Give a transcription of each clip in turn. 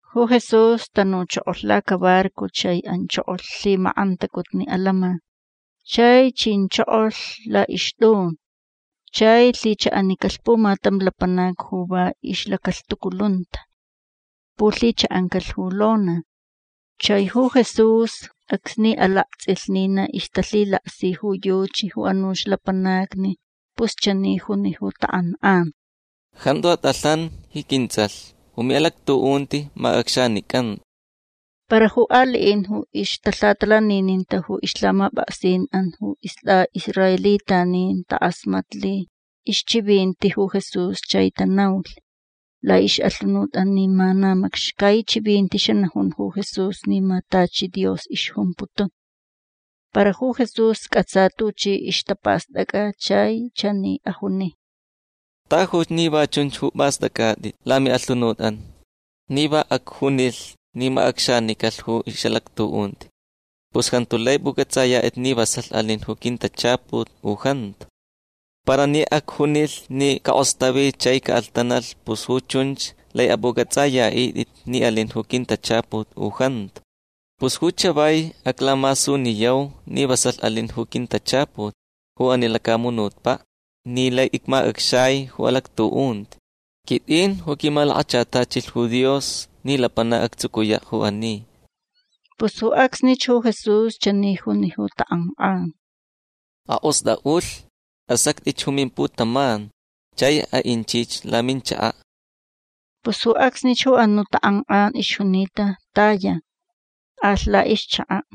Ju Jesús tanuchokolh lacabarco chai anchokolh lhimakʼantacutni atantsʼin. Chai chinchokolh laʼixtʼun. Chai lhichaʼanicalh pumatam lapanac ju va ixlacalhtuculunta. Pulhichaʼancalh ju lona. Chai ju Jesús acsni alaktsʼilh ni na ixtalhilaksi ju yuchi ju anuch lapanacni pus chani juni ju takʼankʼan: ―Jantu atʼalhan ji quintsʼalh. Ju miʼalactuʼunti macʼacxanicanta. Para ju aliʼin ju ixtalhatalanininta ju ixlhamapʼaksinʼan ju istʼaʼisraelitanin takʼasmatlh ixchivinti ju Jesús chai tanaulh laʼixʼalhunutʼan ni ma na macxcai chivinti xanajun ju Jesús ni ma tachi Dios ixjumputun. Para ju Jesús cʼatsa tuchi ixtapastʼacʼa chai chani ajuni: ―Tajuch ni va chunch ju pʼastʼacʼatʼit lamiʼalhunutʼan. Ni va acjunilh ni macʼacxanicalh ju ixʼalactuʼunti pus jantu lai pʼucʼatsʼayatʼit ni vasalh alin ju quintachaput u jantu. Para ni acjunilh ni cakʼostavi chai caʼalhtanalh pus ju chunch lai apʼucʼatsʼayaʼitʼit ni alin ju quintachaput u jantu. Pus ju chavai aclamasuniyau ni vasalh alin ju quintachaput ju ani lacamunutpaʼ ni lai icmacʼacxai ju alactuʼunti. Quitʼin ju quimalakachatachilh ju Dios ni lapanac actsucuyaʼ ju ani. Pus ju acsnich ju Jesús chani juni ju takʼankʼan: ―Akʼostʼaʼulh. Asactʼich ju mimputaman chai aʼinchich laminchakaʼ. Pus ju acsnich ju anuʼ takʼankʼan ixjunita taya. Alh laʼixchakaʼ.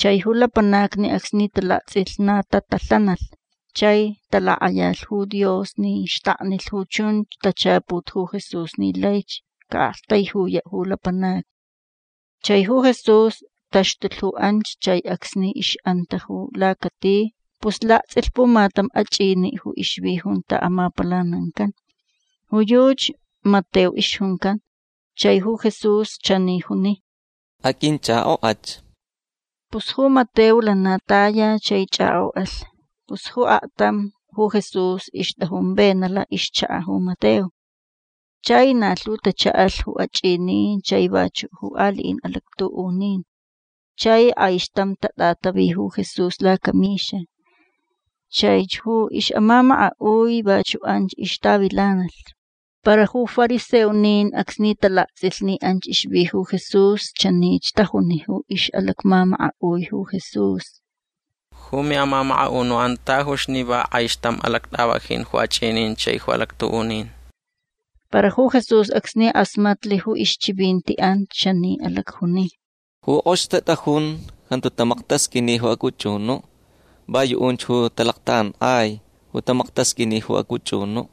Chai ju lapanacni acsni talaktsʼilh na tatalhanalh chai talakʼayalh ju Dios ni xtaknilh ju chunch tachaput ju Jesús ni laich caʼaʼaktaijuyaʼ ju lapanacni. Chai ju Jesús taxtulh ju anch chai acsni ixʼanta ju lacati pus laktsʼilh pumatam achʼiniʼ ju ixvi junta amapalanancan. Ju yuchi Mateo ixjuncan. Chai ju Jesús chani juni: ―Aqʼuinchʼakʼokʼach. Pus ju Mateo lana taya chai chʼakʼokʼalh. Pus ju aktam ju Jesús ixtʼajun venaʼ laʼixchakaʼ ju Mateo. Chai na lhu tachaʼalh ju achʼinin chai vachuʼ ju aliʼin alactuʼunin. Chai kʼaixtam tatʼatavi ju Jesús lacamixa. Chaich ju ixʼamamakaʼui vachuʼ anch ixtavilanalh. Para ju fariseonin acsni talaktsʼilh ni anch ixvi ju Jesús chanich tajuni ju ixʼalacmamakaʼui ju Jesús: ―Ju miʼamamakaʼunuʼan tajuch ni va kʼaixtam alactʼavajin ju achʼinin chai ju alactuʼunin. Para ju Jesús acsni kʼasmatlh ju ixchivintiʼan chani alacjuni: ―Ju kʼox tatʼajun jantu tamaktasqʼuini ju acʼuchʼunuʼ. Va yuʼunch ju talactakʼankʼai ju tamaktasqʼuini ju acʼuchʼunuʼ.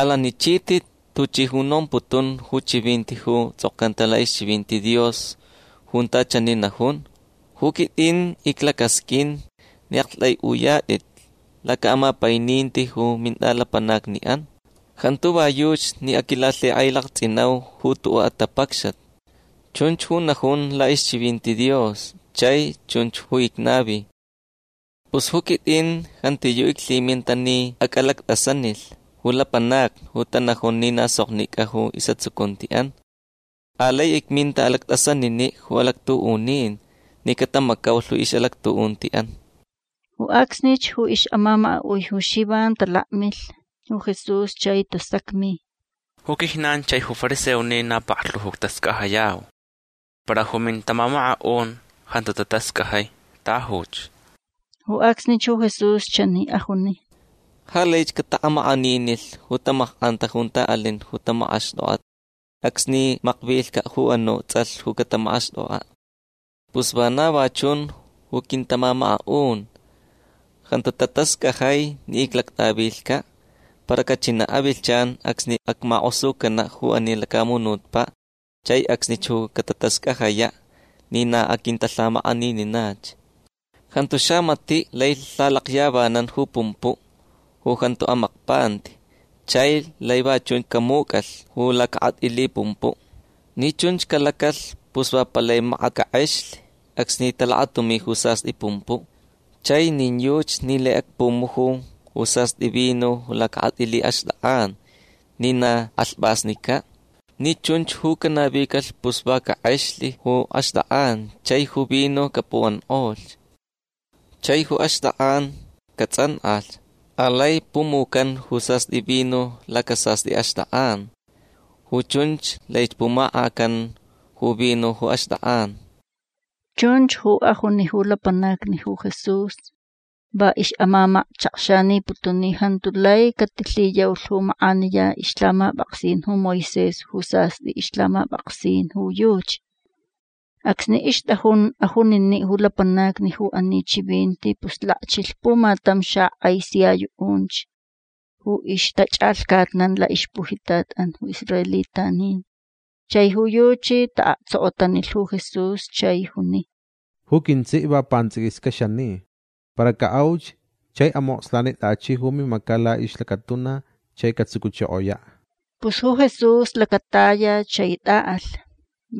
Alanichitʼit tuchi ju nomputun ju chivinti ju tsʼokcanta laʼixchivinti Dios junta chani najun: “Ju quitʼin iclacasqʼuin ni aʼaktʼaiʼuyatʼit lacaʼamapaininti ju mintʼalapanacniʼan. Jantu va yuchi ni aquilalhikʼailaktsʼinau ju tuʼuʼ atapacxat”. Chunch ju najun laʼixchivinti Dios chai chun ju icnavi. Pus ju quitʼin jantiyuʼ iclhiminta ni acʼalactʼasanilh ju lapanacni ju tanajun ni na soknicʼa ju isʼatsucuntiʼan. Alai icminta alactʼasaniniʼ ju alactuʼunin ni catamacaulh ixʼalactuʼuntiʼan. Ju acsnich ju ixʼamamakaʼui ju Xivan talakmilh ju Jesús chai tasacmi: ―Ju quijnan chai ju fariseonin na paklhu ju ictascajayau. Para ju mintamamakaʼun jantu tatascajai. Tajuch. Ju acsnich ju Jesús chani ajuni: ―Ja laich cataʼamakʼaninilh ju tamakʼanta junta alin ju tamakʼaxtʼokʼat acsni makvilhcaʼ ju anuʼ tsʼalh ju catamakʼaxtʼokʼaʼ. Pus vana va chunch ju quintamamakaʼun. Jantu tatascajai ni icʼalactʼavilhcaʼ. Para cachinaʼ avilhchan acsni acmakʼosucanaʼ ju ani lacamunutpaʼ. Chai acsnich ju catatascajayaʼ ni na aquintalhamakʼanininach. Jantu xamatiʼ lai lhalakyavanan ju pumpuʼ ju jantu amakpanti chai lai va chunch camucʼalh ju lacakʼatʼili pumpuʼ. Ni chunch calacalh pus va palai makat cakʼexlh acsni talakatumi ju sastʼi pumpuʼ. Chai nin yuchi ni lai acpumuju ju sastʼi vino lacakʼatʼili axtʼakʼan ni na kʼalhpʼasnicaʼ. Ni chunch ju canavicalh pus va cakʼexlh ju axtʼakʼan chai ju vino capuʼankʼolh. Chai ju axtʼakʼan catsʼankʼalh. Alai pumucan ju sastʼi vino lacasastʼi axtʼakʼan. Ju chunch laich pumakʼacan ju vino ju axtʼakʼan. Chunch ju ajuni ju lapanacni ju Jesús. Va ixʼamamachakxaniputun ni jantu lai catilhiyaulh ju makʼaniya ixlhamapʼaksin ju Moisés ju sastʼi ixlhamapʼaksin ju yuchi. Acsni ixtʼajun ajuniniʼ ju lapanacni ju ani chivinti pus lakchilh pumatam xakʼai sia yuʼunch ju ixtachʼalhcatnan laʼixpujitatʼan ju israelitanin. Chai ju yuchi taʼaktsokotanilh ju Jesús chai juni: ―Ju quintsiʼ va pantsʼiquiscaʼ xani. Para caʼauch chai amokslanitʼachiʼ ju mimacaʼ laʼixlacatuna chai catsucuchokoyaʼ. Pus ju Jesús lacataya chai tʼaʼalh.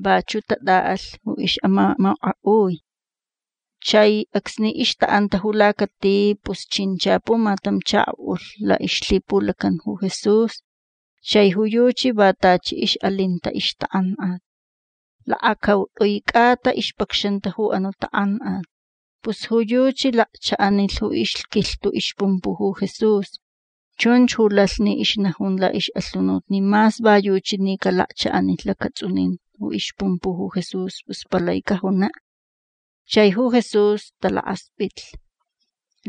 Vachuʼ tatʼaʼalh ju ixʼamamakaʼui. Chai acsni ixtaʼanta ju lacati pus chincha pumatam chakoʼulh laʼixlhipulacan ju Jesús. Chai ju yuchi va tachi ixʼalinta ixtakʼankʼat. Lakacautʼui cʼata ixpacxanta ju anuʼ takʼankʼat. Pus ju yuchi lakchaʼanilh ju ixquilhtuʼ ixpumpuʼ ju Jesús. Chunch ju lalh ni ixnajun laʼixʼalhunut ni mas va yuchi ni calakchaʼanilh lacatsʼunin ju ixpumpuʼ ju Jesús pus palai cajunaʼ. Chai ju Jesús talakaspʼitlh.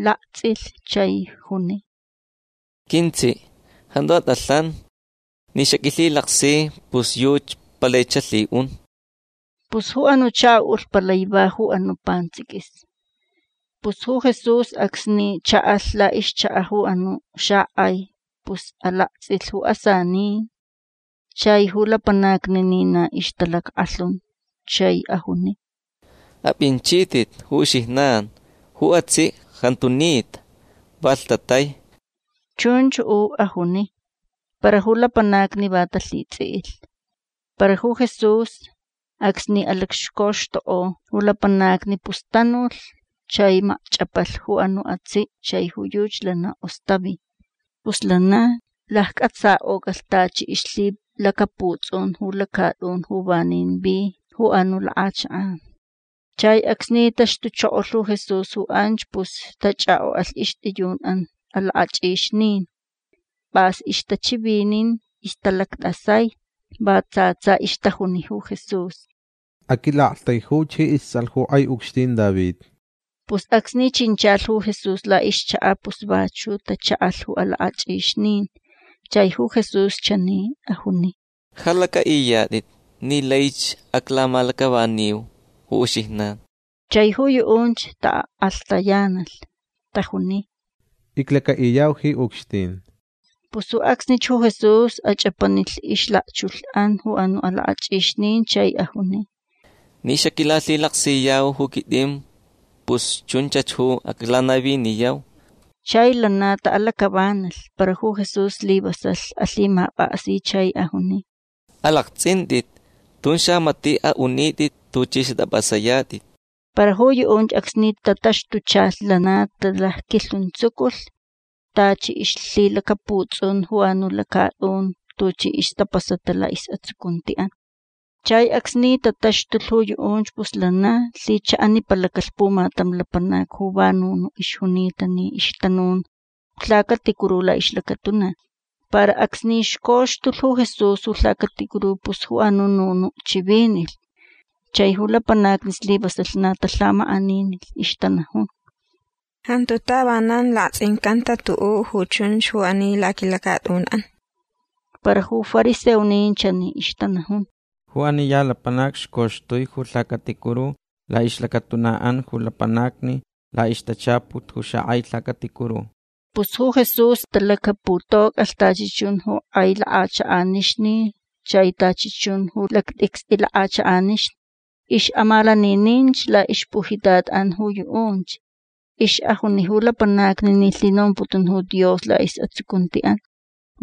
Laktsʼilh chai juni: ―Quintsiʼ jantu atʼalhan. Ni xaquilhilaksi pus yuchi palai xalhiʼun. Pus ju anuʼ chakoʼulh palai va ju anuʼ pantsʼiquis. Pus ju Jesús acsni chaʼalh laʼixchakaʼ ju anuʼ xakʼai pus alaktsʼilh ju asanin chai ju lapanacni ni na ixtalackʼalhun. Chai ajuni: ―Apʼinchitʼit ju uxijnan. Ju atsiʼ jantu nita. Va lhtatai. ―Chunch ju ajuni. Para ju lapanacni va talhitsʼiʼilh. Para ju Jesús acsni alacxcoxtukʼo ju lapanacni pus tanulh chai macchʼapalh ju anuʼ atsiʼ chai ju yuchi lana kʼostavi. Pus lana laccʼatsakʼocalh tachi ixlhilacaputsʼun ju lacatʼun ju vanin vi ju anuʼ lakʼachakʼan. Chai acsni taxtuchokolh ju Jesús ju anch pus tachʼakʼokʼalh ixtʼiyunʼan alakʼachʼixnin. Pʼas ixtachivinin. Ixtalactʼasai. Va tsa tsa ixtajuni ju Jesús: ―Aquilaʼaktaijuch ji istsʼalh ju kʼai ucxtin David. Pus acsni chinchalh ju Jesús laʼixchakaʼ pus vachuʼ tachaʼalh ju alakʼachʼixnin. Chai ju Jesús chani ajuni: ―Ja lacʼaʼiyatʼit ni laich aclamalacʼavaniu ju uxijnan. Chai ju yuʼunch takʼalhtayanalh. Tajuni: ―Iclacaʼiyau ji ucxtin. Pus ju acsnich ju Jesús achʼapanilh ixlakchulhʼan ju anuʼ alakʼachʼixnin chai ajuni: ―Ni xaquilalhilaksiyau ju quitʼin pus chunchach ju aclanaviniyau. Chai lana taʼalacʼavanalh. Para ju Jesús slivasalh alhimapʼaksi. Chai ajuni: ―Alaktsʼintʼit. Tun xamatiʼ aʼunitʼit tuchʼi xatʼapʼasayatʼit. Para ju yuʼunch acsni tataxtuchalh lana talacquilhuntsuculh tachi ixlhilacaputsʼun ju anuʼ lacatʼun tuchi ixtapasata laʼisʼatsucuntiʼan. Chai acsni tataxtulh ju yuʼunch pus lana lhichaʼanipalacalh pumatam lapanac ju va nunuʼ ixjunita ni ixtanun ju lhacaticuru laʼixlacatuna. Para acsni xcoxtulh ju Jesús ju lhacaticuru pus ju anuʼ nunuʼ chivinilh. Chai ju lapanacni slivasalh na talhamakʼaninilh. Ixtanajun: ―Jantu tavanan laktsʼincanta tuʼuʼ ju chunch ju ani laquilacatʼunʼan. Para ju fariseonin chani ixtanajun: ―Ju ani ya lapanac xcoxtui ju lhacaticuru laʼixlacatunaʼan ju lapanacni laʼixtachaput ju xakʼai lhacaticuru. Pus ju Jesús talacaputocʼalh tachi chun ju kʼai lakʼachakʼanixni chai tachi chun ju lactʼicstʼi lakʼachakʼanixni. Ixʼamalanininch laʼixlacpujitatʼan ju yuʼunch. Ixʼajuni ju lapanacni ni lhinomputun ju Dios laʼisʼatsucuntiʼan.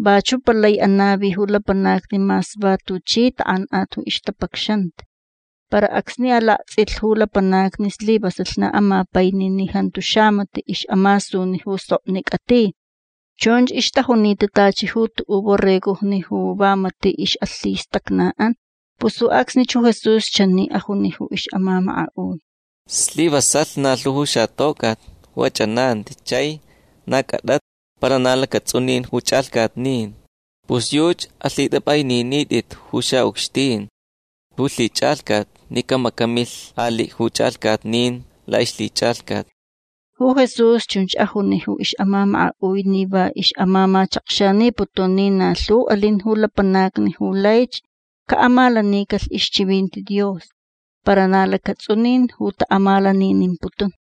Vachuʼ palai anavi ju lapanacni mas va tuchi takʼankʼat ju ixtapacxanta. Para acsni alaktsʼilh ju lapanacni slivasalh na amapaini ni jantu xamatiʼ ixʼamasuni ju soknicʼa ti. Chunch ixtajunita tachi ju tuʼuʼ borregojni ju va matiʼ ixʼalhistacnaʼan. Pus ju acsnich ju Jesús chani ajuni ju ixʼamamakaʼui: ―Slivasalh na lhu ju xatocʼat ju achʼananti chai na cʼatata para na lacatsʼunin ju chʼalhcatnin. Pus yuchi alhitʼapʼaininitʼit ju xaʼucxtin ju lhichʼalhcat ni camacamilh aliʼ ju chʼalhcatnin laʼixlhichʼalhcat. Ju Jesús chunch ajuni ju ixʼamamakaʼui ni va ixʼamamachakxaniputun ni na lhu alin ju lapanacni ju laich caʼamalacaʼinicalh ixchivinti Dios para na lacatsʼunin ju taʼamalaninimputun.